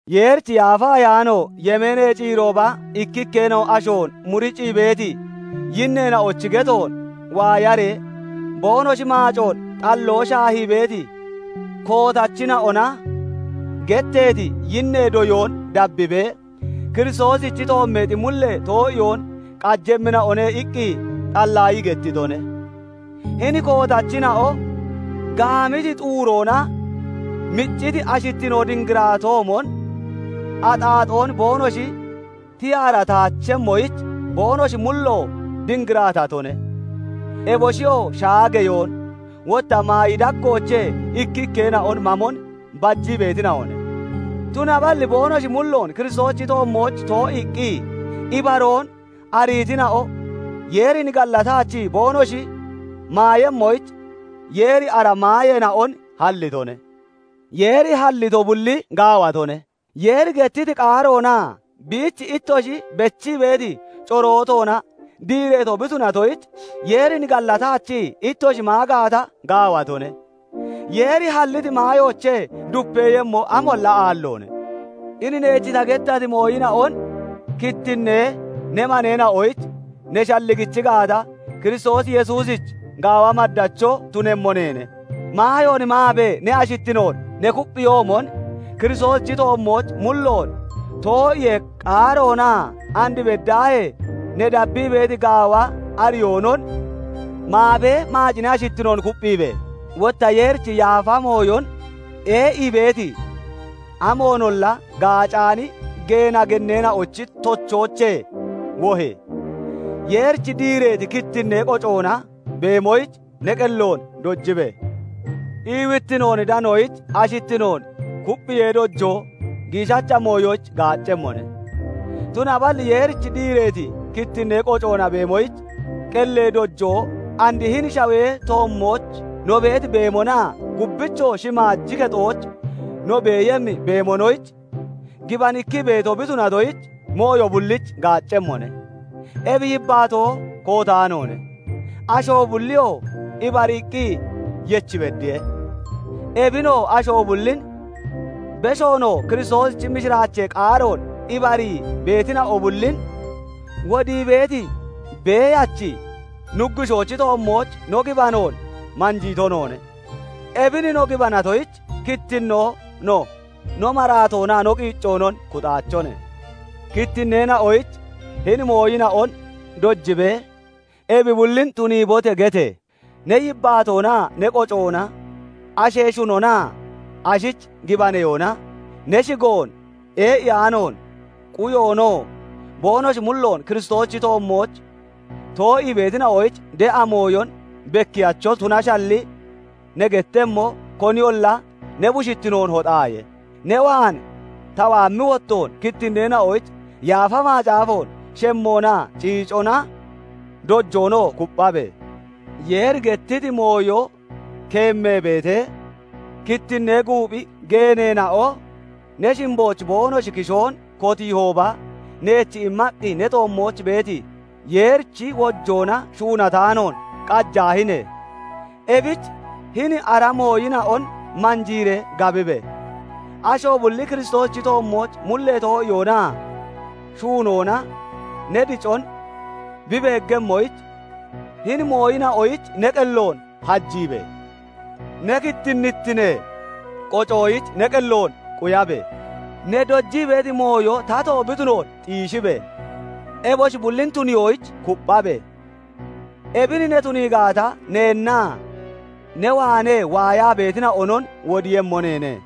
Yeerichi Yaafa Ayaano "Yemeenee ciirooba ikkikkeena'o, ashoon muricii beeti yinneena'ochi getoon waayaree, boonoshi maacoon xalloo shaahii beeti kootachina'ona getteeti yinnee doyoon dabbibee, Kiristoosichi toommeexi mullee too'iyoon qajemmina'one" iqqi xallaayii gettitone. [Hini kootachina'o, gaamiti xuuroona micciti ashittino dingiraatoomon, axaaxoon boonoshi tiyaarataachemmoyich boonoshi mullo dingiraatatone.] Eboshiyoo shaageyoon, wotta maayi daggoochee ikkikkeena'on mamon bajii beetina'one; tunaballi boonoshi mulloon Kiristoosichi toommooch too'iiqqi ibaroon ariitina'o Yeerin gallataachi boonoshi maayemmoyich, Yeeri ara maayeena'on hallitone. Yeeri hallito bulli gaawatone; Yeeri gettiti qaaroonaa biich ittoshi bechii beeti corootoona diireeto bi tunatoyich, Yeerin gallataachii ittoshi maa gaata, gaawatone; Yeeri halliti maayoochee dupeeyemmi amolla aalloone. Hini neech ta gettati mooyina'on kittinnee ne maneena'oyich ne shalligichi gaata, Kiristoos Yesuusich gaawa maddachon tunemmo neene. Maayoon maabee ne ashittinoon ne kupphiyoomon, Kiristoosichi toommooch mulloon too'iyee qaaroonaa and beddaahee ne dabbii beeti gaawa ariyoonon maabee maaci ne ashittinoon kupphiibe! Wotta Yeerichi yaafa mooyon ee'ii beeti, amoonolla gaacaani geena genneena'ochi tochoochee wohe! Yeerich diireeti kittinnee qocoona beemoyich ne qelloon dojibe! Iiwittinoon danoyich ashittinoon kupphiyee dojoo giishacha mooyoyich gaaccemmone; tunaballi Yeerich diireeti kittinnee qocoona beemoyich qellee dojoo, and hini shawee toommooch no beeti beemonaa gubbichoo shimaaji kexooch no beeyemmi beemonoyich gibanikkii beeto bi tunatoyich, mooyo bullich gaaccemmone. Ebi yibbaatoo kootaanoone; asho bulliyoo ibariiqqi yech beddiye. Ebinoo asho bullin, beshoonoo Kiristoosichi mishiraachee qaaroon ibarii beetina'o bullin, wodii beeti Beeyachi Nuggushoochi toommooch no gibanoon manjiito noone; ebin no gibanatoyich, kittinnoo no, no maraatoonaa no qiiccoonon kuxaachone. Kittinneena'oyich hini mooyina'on dojiibee, ebi bullin "Tuniibote!" gete! Ne yibbaatoonaa ne qocoona, ashee shunonaa ashich gibaneyoona, ne shigoon ee'iyaanoon quyoonoo boonoshi mulloon Kiristoosichi toommooch too'ii beetina'oyich de'a mooyon bekkiyacho tunashalli ne gettemmo, koniyolla ne bushittinoon hoxaaye! Ne waan ta waammi wottoon, kittinneena'oyich Yaafa Macaafoon shemmoonaa ciicona, dojoonoo kupphabe! Yeeri gettiti mooyo keemmee beetee, kittinnee guuphi geeneena'o ne shimbooch boonoshi kishoon kotiihooba, neech immaqqi ne toommooch beeti Yeerichi wojoona shuunataanoon qajaahine! Ebich hini ara mooyina'on manjiiree gabibe! Asho bulli Kiristoosichi toommooch mullee too'iyoonaa shuunoona ne dicon bi beeggemmoyich, hini mooyina'oyich ne qelloon hajiibe! Ne kittinnittinee qocoyich ne qelloon quyabe! Ne dojii beeti mooyo tato bi tunoon xiishibe! Eboshi bullin tuniyoyich kupphabe! Ebin ne tunii gaata, neennaa ne waanee waayaa beetina'onon wodiiyemmo neene.